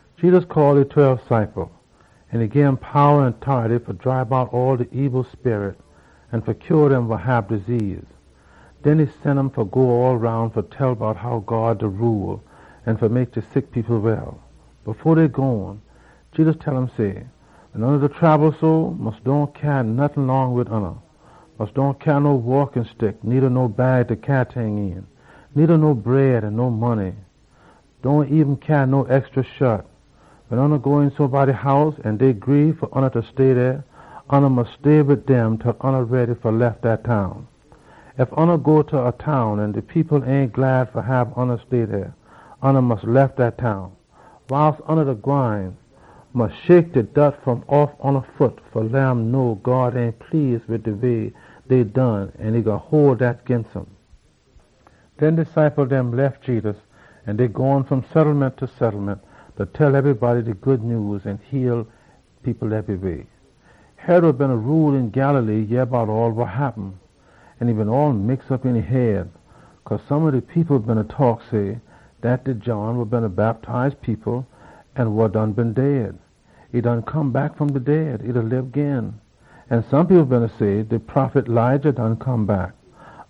Jedus call e tweb ciple dem, an e gim powa an tority fa dribe out all de ebil sperit dem an fa heal dem wa sick. Den e sen um fa go all roun fa tell bout how God da rule, an fa mek de sick people well. Fo dey gone, Jedus tell um say, “Wen oona da trabel so, mus dohn tote nottin long wid ya. Mus dohn cyaa no stick fa waak, needa no bag fa cyaa ting een, needa no bread an no money. Dohn eben cyaa no extry shat. Wen ya go een somebody house an dey gree fa leh ya stay dey, ya mus stay wid dem til ya ready fa lef dat town. Ef ya go ta a town an de people ain heppy fa hab ya stay dey, mus lef dat town. Wiles ya da gwine, mus shake de dort fom off ya foot fa leh um know God ain please wid de way dey done an e gwine hole dat ginst um.” Den de ciple dem lef Jedus, an dey gone fom settlement ta settlement, da tell ebrybody de Good Nyews an heal people ebryweh. Herod wa beena rule een Galilee yeh bout all wa happen. E been all mix op een e head, cause some ob de people beena taak say dat John wa Bactize wa done come back fom de dead. An some people beena say dat de prophet Elijah come back.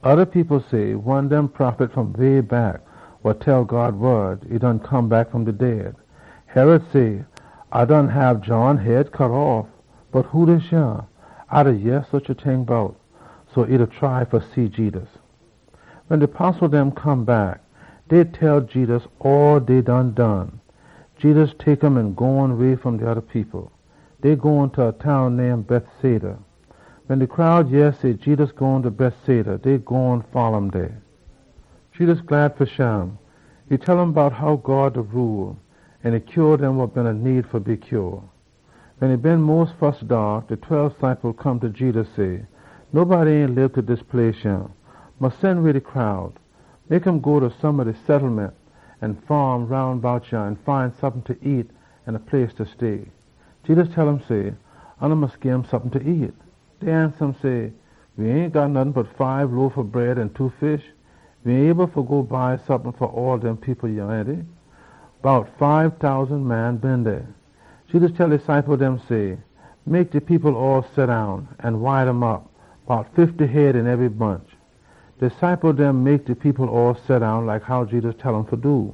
Oda people say dat one ob dem prophet fom way back done come back fom de dead. Herod say, “A done hab John head cut off. Bot who dis yah A da yeh susha ting bout?” So e beena try fa see Jedus. Wen de postle dem come back, dey tell Jedus all wa dey done done. Jedus tek um an gone way fom de oda people. Dey gone ta a town name Bethsaida. Wen de crowd yeh say Jedus gone ta Bethsaida, dey gone folla um dey. Jedus glad fa shim. E tell um bout how God da rule, an e heal dem wa been need fa be heal. Wen e been mos fus daak, de tweb ciple dem come ta Jedus say, “Nobody ain lib ta dis place yah. Mus sen way de crowd. Mek um go ta some ob de settlement an faam dem roun bout yah an find sompin fa nyam an a place fa stay.” Jedus tell um say, “Oona mus gim sompin fa nyam.” Dey ansa um, “We ain got nottin bot fibe loaf ob bread an two fish. We ain able fa go buy sompin fa all dem people yah, ainty?” Bout fibe tousan man been dey. Jedus tell e ciple dem say, “Mek de people all seddown, an wide um op, bout fifty head een ebry bunch.” De ciple dem mek de people all seddown like how Jedus tell um fa do.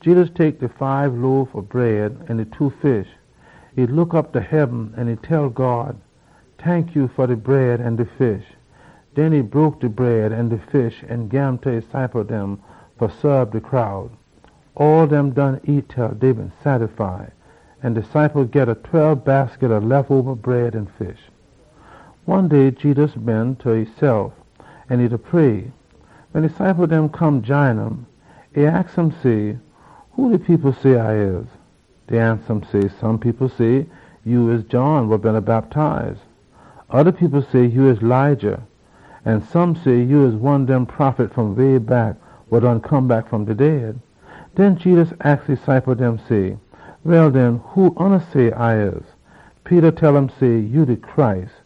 Jedus tek de fibe loaf ob bread an de two fish. E look op ta heaben an e tell God, “Tankya fa de bread an de fish.” Den e broke de bread an de fish an gim ta e ciple dem fa saab de crowd. Ebrybody nyam til dey been sattify. An de ciple dem geda tweb basket ob lef oba bread an fish. One day Jedus been ta esef an e beena pray. Wen e ciple dem come jine um, e aks um say, “Who de people say A da?” Dey ansa um say, “Some people say ya John wa Bactize. Oda people say ya Elijah. An some say ya one dem prophet fom way back wa done come back fom de dead.” Den Jedus aks e ciple dem say, “Well den, who oona say A da?” Peter tell um say, “Ya de Messiah.”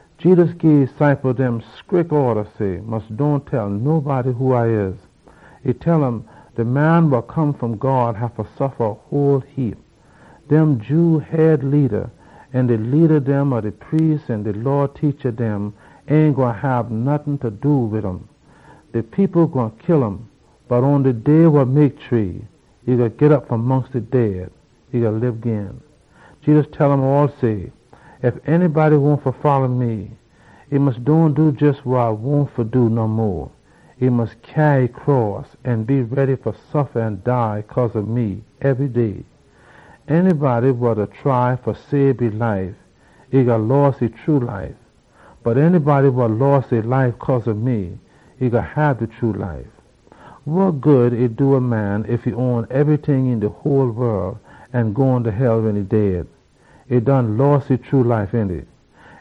Jedus gii e ciple dem scrick orda say, “Mus dohn tell nobody who A da.” E tell um, “De Man wa Come fom God haffa suffa a whole heap. Dem Jew head leada an de leada dem ob de priest dem an de Law teacha dem ain gwine hab nottin fa do wid um. De people gwine kill um, bot atta shree day e gwine git op fom mongst de dead an lib gin.” Jedus tell um all say, “Ef a poson wahn fa come wid me, e mus dohn do jes wa e wahn fa do no mo. E haffa tote e cross an folla me ebry day. De poson wa da try fa sabe e life, e gwine loss e true life. Bot de poson wa loss e life cause ob me, e gwine git de true life. Wa good e do a man ef e git ebryting een de whole wol an e gone ta hell wen e dead? E done loss e true life, ainty?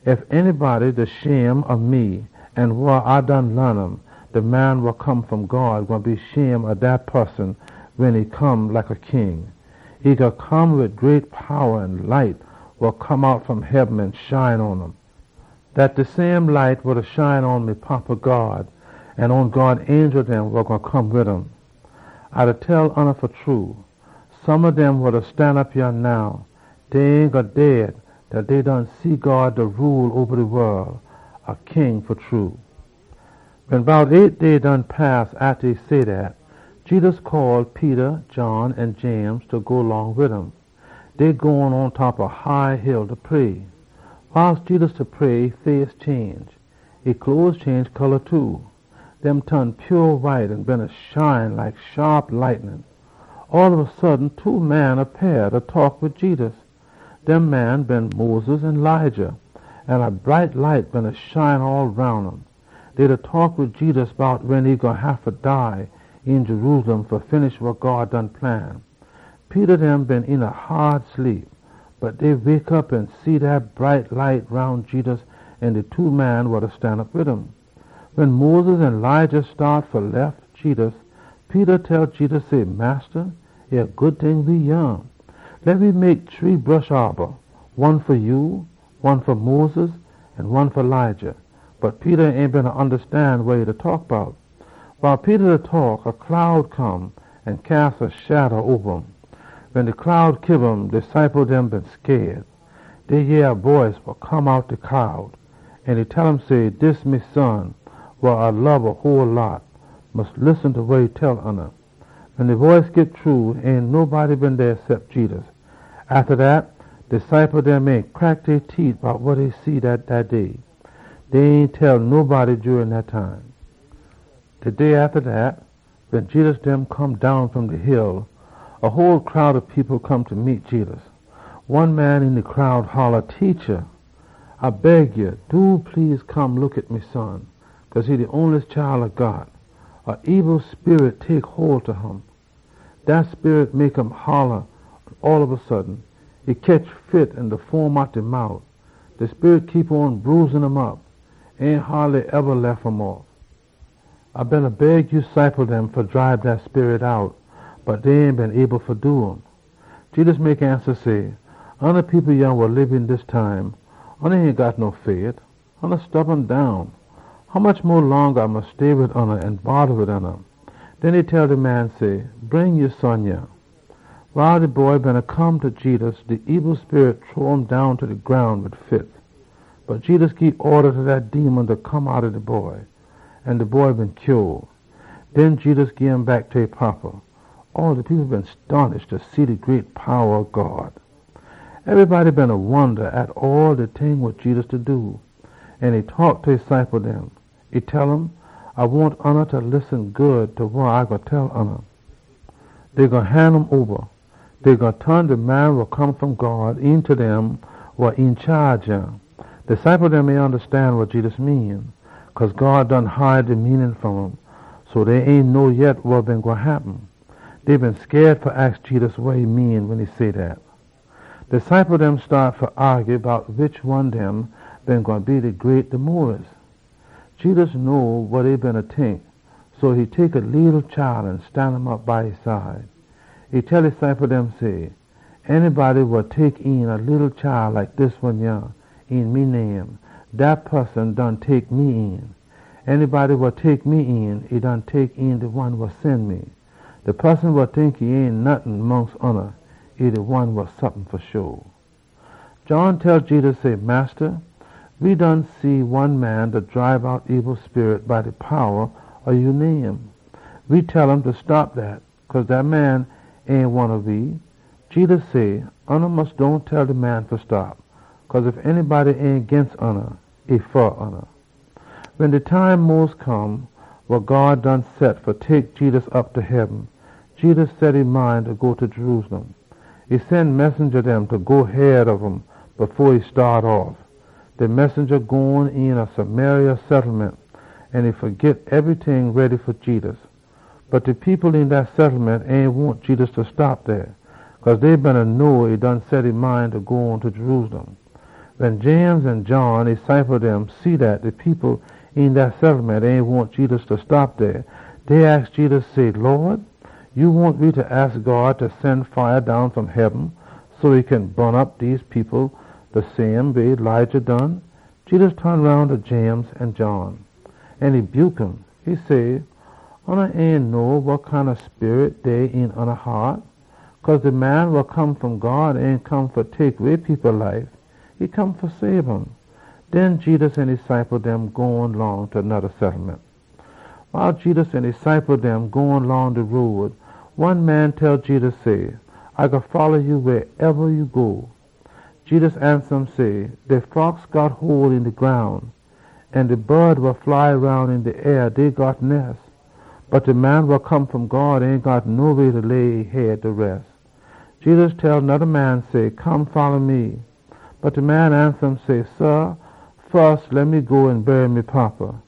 Ef anybody da shame ob me an wa A done laan um, de Man wa Come fom God gwine be shame ob dat poson wen e come like a king. E gwine come wid great powa an light wa come out fom heaben an shine pon um. Dat de same light wa da shine pon me Fada God an pon God angel dem wa gwine come wid um. A da tell oona fa true, some ob dem wa da stanop yah now, dey ain gwine dead til dey done see God da rule oba de wol, a king fa true.” Wen bout eight day done pass atta e say dat, Jedus call Peter, John, an James fa go long wid um. Dey gone pontop a high hill fa pray. Wiles Jedus beena pray, e face change. E cloes change too. Dey ton pure white an beena shine like shaap lightnin. All ob a sudden two man appeah, da taak wid Jedus. Dem man been Moses an Elijah, an a bright light beena shine all roun um. Dey beena taak wid Jedus bout wen e gwine haffa dead een Jerusalem fa finish wa God done plan. Peter dem been een a haad sleep. Bot dey wake op an see dat bright light roun Jedus an de two man dem wa beena stan wid um. Wen Moses an Elijah staat fa lef Jedus, Peter tell Jedus say, “Massa, e a good ting we yah! Leh we mek shree bush aaba, one fa ya, one fa Moses, an one fa Elijah.” Bot Peter ain beena ondastan wa e beena taak bout. Wiles Peter beena taak, a cloud come an cyas a shada oba um. Wen de cloud kiba um, de ciple dem been scaid. Dey yeh a boice wa come outta de cloud. An e tell um say, “Dis me Son, wa A lob a whole heap. Mus listen ta wa e tell oona!” Wen de boice git shru, ain nobody been dey cep Jedus. Atta dat, de ciple dem ain crack dey teet bout wa dey been see dat day. Dey ain tell nobody jurin dat time. De day atta dat, wen Jedus dem come down fom de hill, a whole crowd ob people come fa meet Jedus. One man een de crowd holla, “Teacha, A da beg ya! Do please, come look at me son, cause e de onliest chile A got. A ebil sperit tek hole ta um. Dat sperit mek um holla all ob a sudden. E ketch fits, an e da foam out de mout. De sperit keep on da bruise um op. Ain haadly eba lef um off. A beena beg ya ciple dem fa dribe dat sperit out, bot dey ain been able fa do um.” Jedus mek ansa say, “Oona people yah wa lib een dis time ain got no fait! Oona ain ondastan nottin. Hommuch mo longa A gwine haffa pit op wid oona?” Den e tell de man say, “Bring ya son yah.” Wiles de boy beena come ta Jedus, de ebil sperit shrow um down ta de groun wid fits. Bot Jedus gii orda ta dat ebil sperit fa come outta de boy, an de boy been heal. Den Jedus gim back ta e fada. All de people been stonish fa see de great powa ob God. Ebrybody beena wonda at all de ting dem wa Jedus beena do. An e taak ta e ciple dem. E tell um say, “A wahn oona fa listen good ta wa A gwine tell oona. Dey gwine han um oba. Dey gwine ton de Man wa Come fom God een ta dem wa een chaage yah.” De ciple dem ain ondastan wa Jedus mean. Cause God done hide de meanin fom um, so dey ain know yet wa been gwine happen. Dey been scaid fa aks Jedus wa e mean wen e say dat. De ciple dem staat fa aagy bout wish one dem been gwine be great de mos. Jedus know wa dey beena tink, so e tek a leetle chile an stan um op by e side. E tell e ciple dem say, “Anybody wa tek een a leetle chile like dis one yah een me name, dat poson done tek me een. An anybody wa tek me een, e done tek een de one wa sen me. De poson wa tink e ain nottin mongst oona, e de one wa sompin fa sho.” John tell Jedus say, “Massa, we done see one man da dribe out ebil sperit by de powa ob ya name. We tell um fa stop dat, cause dat man ain one ob we.” Jedus say, “Mus dohn tell de man fa stop, cause ef anybody ain ginst oona, e fa oona.” Wen de time mos come wa God done set fa tek Jedus op ta heaben, Jedus set e mind fa go ta Jerusalem. E sen messenja dem fa go head ob um fo e staat off. De messenja dem gone een a Samaria settlement fa git ebryting ready fa Jedus. Bot de people een dat settlement ain wahn Jedus fa stop dey, cause dey been know e done set e mind fa go on ta Jerusalem. Wen James an John, e ciple dem, see dat de people een dat settlement ain wahn Jedus fa stop dey, dey aks Jedus say, “Lawd, ya wahn we fa aks God fa sen fire down fom heaben fa bun op dem people?” Jedus ton roun ta James an John an e buke um. [E say, “Oona ain know wa kind ob sperit dey een oona haat. Cause de Man wa Come fom God ain come fa tek way people life. E come fa sabe um.”] Den Jedus an e ciple dem gone long ta noda settlement. Wiles Jedus an e ciple dem gone long de road, one man tell Jedus say, “A gwine folla ya wehsoneba ya go.” Jedus ansa um say, “De fox got hole een de groun, an de bod wa fly roun op een de air dey got nes. Bot de Man wa Come fom God ain got noweh fa lay e head.” Jedus tell noda man say, “Come folla me!” Bot de man ansa um say, “Sah, fus leh me go an bury me fada.”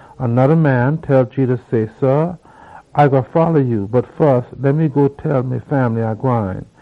An noda man tell Jedus say, “Sah, A gwine folla ya, bot fus leh me go tell me fambly A da gwine.”